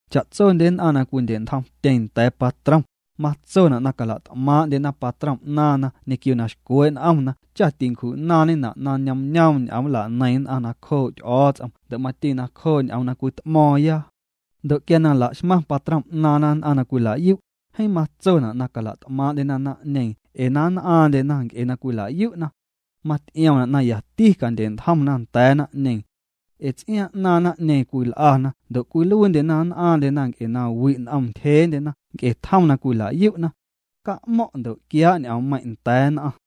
Cha'tsondye nn'aⁿ na cwindye'ntjomtyeⁿ nda̱a̱ patrom, matsona' na cala't'maaⁿ'ndyena patrom 'naaⁿna ñequio na xcwee' n'omna cha tincju'naaⁿñena' na ñoomñoom ñ'oom nlaneiⁿ nn'aⁿ nacjoo' Ty'o̱o̱ts'om ndo' mati nacjoo' ñ'oom na cwit'mo̱o̱ⁿya. Ndo' quia la'xmaⁿ patrom 'naaⁿna nn'aⁿ na cwila'yu', jeeⁿ matsona' na cala't'maaⁿ'ndyena naⁿ'ñeeⁿ ee na nn'aaⁿndyena nc'e na cwila'yu'na. Maty'iomna' na yati candye'ntjomna nda̱a̱ naⁿ'ñeeⁿ. Ee ts'iaaⁿ 'naaⁿ naⁿ'ñeeⁿ cwil'ana ndo' cwiluiindyena na nn'aaⁿndyena na wi' n'om ntyjeendyena nc'e tjom na cwila'yu'na. Ca'mo̱ⁿ' ndo' quiaa' ñ'oommeiⁿ' nda̱a̱ nn'aⁿ.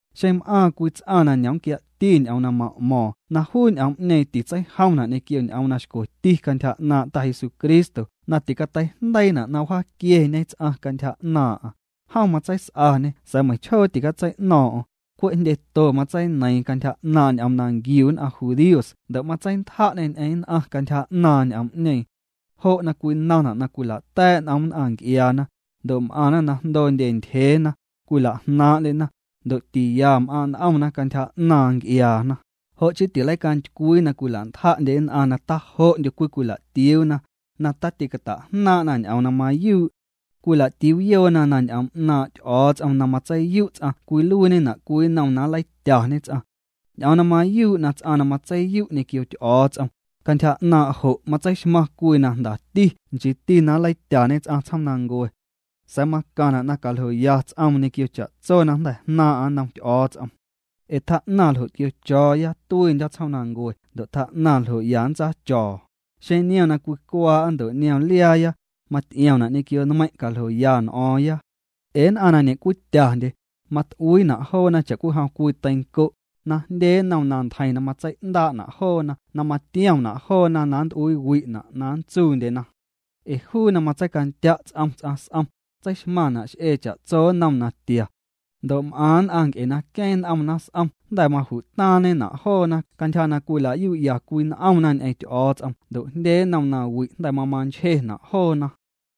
Xeⁿ m'aaⁿ cwii ts'aⁿ na ñomquiati ñ'oom na ma'mo̱o̱ⁿ na juu ñ'oom'ñeeⁿ titseijomna' ñequio ñ'oom na xcweti cantyja 'naaⁿ' Ta Jesucristo na ticateijndeiina' na wjaaquieñe ts'aⁿ cantyja 'naaⁿ'aⁿ, jom matseis'aañê sa̱a̱ meiⁿchjoo ticatsei'no̱o̱ⁿ'o̱ⁿ, cwe' jndyeto matseineiiⁿ cantyja 'naaⁿ' ñ'oom na nquiu nn'aⁿ judíos ndo' matseintja'ñê ñ'eⁿ nn'aⁿ cantyja 'naaⁿ n'oom'ñeeⁿ. Jo' na cwinaⁿna' na cwila'ta̱a̱' n'om nn'aⁿ nc'iaana, ndo' m'aⁿna na jndoondye ntyjeena, cwila'jnaaⁿ'ndyena, ndo' tiya m'aaⁿ' n'omna cantyja 'naaⁿ nc'iaana, jo' chii tileicantycwii na cwila'ntja'ndye nn'aⁿ na tajo'ndyo cwicwila'tiuuna, na tatîcata'jnaaⁿ'na ñ'oom na mayuu'. Cwila'tiuuyoona na ñ'oom 'naaⁿ' Ty'o̱o̱ts'om na matseiyu' ts'aⁿ cwiluiiñena' cwii nnom na nleityañe ts'aⁿ. Ñ'oom na mayuu' na ts'aⁿ na matseiyu' ñequio Ty'o̱o̱ts'om, cantyja 'naaⁿ' jo' matseixmaⁿ cwii na jndati nchiiti na nleityañe ts'aⁿ tsjoomnancue. Sa̱a̱ macaⁿna' na caljoya ts'oom ñequio cha'tso na jnda̱ jnaaⁿ'aⁿ nnom Ty'o̱o̱ts'om. Ee tjaa'naⁿ ljo' tquio̱cho̱o̱ya tuiindyo̱ tsjoomnancue ndo' tjaa'naⁿ ljo' ya nntsaacho̱o̱, xeⁿ niom na cwicwaa'a ndo' niom liaaya, maty'iomna' ñequio nmeiⁿ' caljoya n'o̱o̱ⁿya. Ee nn'aⁿ na ñe'cwityandye, mat'uiina' joona cha'cwijom cwii teinco', na jndye nnom na ntjeiⁿ na matsei'ndaa'na' joona na matiomna' joona na nnt'uiiwi'na' na nntsuundyena. Ee juu na matseicandya' ts'om ts'aⁿ s'om, tseixmaⁿna' x'ee cha'tso nnom natia. Ndo' m'aⁿ nn'aⁿ nc'e na queeⁿ n'omna s'om jnda̱ maju'taaⁿñena' joona cantyja na cwila'yu'ya cwii n'omna ñ'eⁿ Ty'o̱o̱ts'om ndo' jndye nnom nawi' jnda̱ mamanchjena' joona.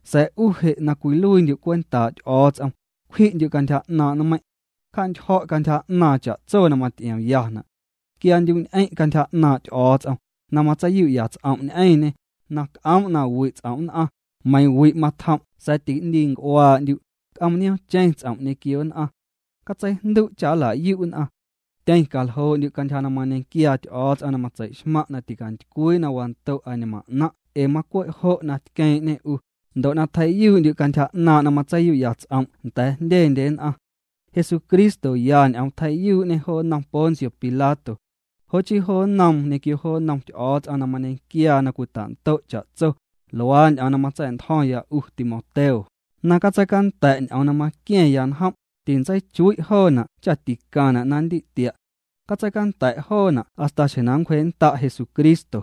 Sa̱a̱ 'u je' na cwiluiindyu' cwentaa' Ty'o̱o̱ts'om, cwji'ndyu' cantyja 'naaⁿ' nmeiiⁿ'. Cja'ntyjo̱' cantyja 'naaⁿ cha'tso na maty'iomyana'. Quiaandyu'ñ'eⁿ' cantyja 'naaⁿ' Ty'o̱o̱ts'om, na nntseiyu'ya' ts'om' ñ'eⁿñê, na c'oom' na wi' ts'om' nn'aⁿ, meiiⁿ wi' matjom' sa̱a̱ ti'ndiinc'uaa'ndyu', c'oom nioom'cheⁿ ts'om' ñequio nn'aⁿ. Catseijndu' cha nla'yu' nn'aⁿ. Tyeⁿcaljoo'ndyu' cantyja na mañequiaa Ty'o̱o̱ts'om na matseixmaⁿ' na ticantycwii na wando' añmaⁿ 'naⁿ' ee macwe' jo' tqueeⁿ'ñê 'u, ndo' na tjei'yuu'ndyu' cantyja 'naaⁿ' na matseiyu'ya' ts'om' nda̱a̱ jndyendye nn'aⁿ. Jesucristo ya ñ'oom tjei'yuu'ñê jo nnom Poncio Pilato. Jo' chii jo nnoom ñequio jo nnom Ty'o̱o̱ts'om na mañequiaa na cwita'ndo' cha'tso, luaa ñ'oom na matsa̱'ntjo̱ⁿya 'u Timoteo, na catseicanda̱' ñ'oom na maqua̱ⁿya njom', tintseichui' joona' cha ticaⁿna' na ndi'tia'. Catseicanda̱' joona' hasta xjeⁿ na nncwjee'nnda' Jesucristo.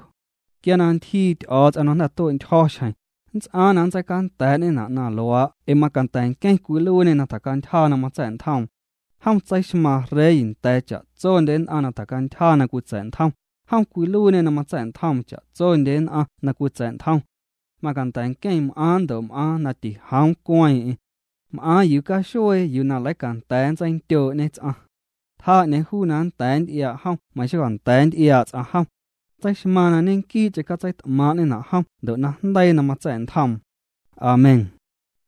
Quia na ntyjii Ty'o̱o̱ts'om na jnda̱ tue'ntyjo̱ xjeⁿ, nnts'aaⁿ na nntseicanda̱a̱'ñena' na luaa' ee macanda̱ nqueⁿ cwiluiiñê na tjacantyja na matsa̱'ntjoom. Jom tseixmaaⁿ Rey nda̱a̱ cha'tsondye nn'aⁿ na tjacantyja na cwitsa̱'ntjom, jom cwiluiiñê na matsa̱'ntjoom cha'tsondye nn'aⁿ na cwitsa̱'ntjom. Manda̱ nqueⁿ m'aaⁿ ndo' m'aaⁿ na tijoom cueeⁿ'eⁿ. M'aaⁿ yuu caxuee yuu na leicanda̱a̱ nntseindyoo'ñe ts'aⁿ. Tjaa 'ñeeⁿ juu na jnda̱ nty'iaa' jom meiⁿ xonda̱a̱ nty'iaa' ts'aⁿ jom. Tseixmaaⁿ na ñequii'cheⁿ catseit'maaⁿ'ñena' jom ndo' najndeii na matsa̱'ntjoom. Amén.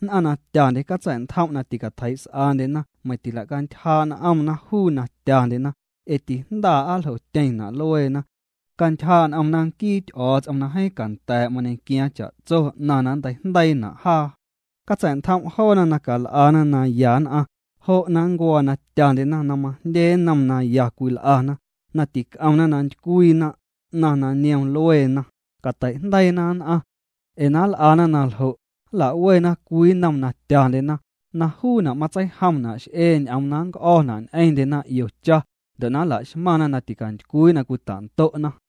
Nn'aⁿ na tyandye, catsa̱'ntjom' na ticatjeii's'andyena meiⁿ tilacantyjaa' n'omna juu na tyandyena, ee tijndaa' aa nljotyeⁿna' lueena. Cantyjaa' n'omna nquii Ty'o̱o̱ts'om na jeeⁿ canda̱a̱' mañequiaaⁿ cha'tso 'naⁿ na nnteijndeiina' jaa. Catsa̱'ntjom' joona na cal'ana naya nn'aⁿ, jo' na nncuaa na tyandyena na majndye nnom na ya cwil'ana, na tic'omna na ntycwiina, 'naⁿ na niom lueena, catei'jndeiina nn'aⁿ. Ee na nl'ana na ljo', nla'wena cwii nnom na tyandyena, na juuna' matseijomna' x'ee ñ'oom na nnc'o̱na' ñ'eⁿndyena 'io cha, ndo' na nla'xmaⁿna na ticantycwii na cwita'ndo'na.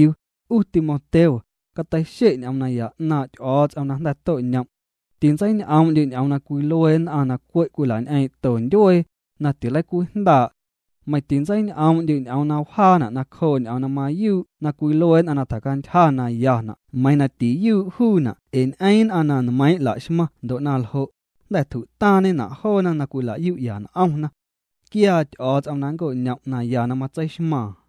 'U Timoteo, cateixe' ñ'oom naya 'naaⁿ' Ty'o̱o̱ts'om na jnda̱ to'ñom'. Tintseiñ'oom'ndyu' ñ'oom na cwilue nn'aⁿ na cwe' cwila'ñ'eeⁿ'to ndyuee, na tileicwijndaa'. Meiⁿ tintseiñ'oom'ndyu' ñ'oom na wjaana' nacjoo' ñ'oom na mayuu' na cwilue nn'aⁿ na tjacantyja na yana' meiiⁿ na tiyuu' juuna' ee ñ'eeⁿ nn'aⁿ na nmeiiⁿ' laxmaⁿ ndo' na ljo', jnda̱ tju'taaⁿñena' joona na cwilayu'ya n'omna. Quiaa Ty'o̱o̱ts'om na nncoñom' naya na matseixmaaⁿ.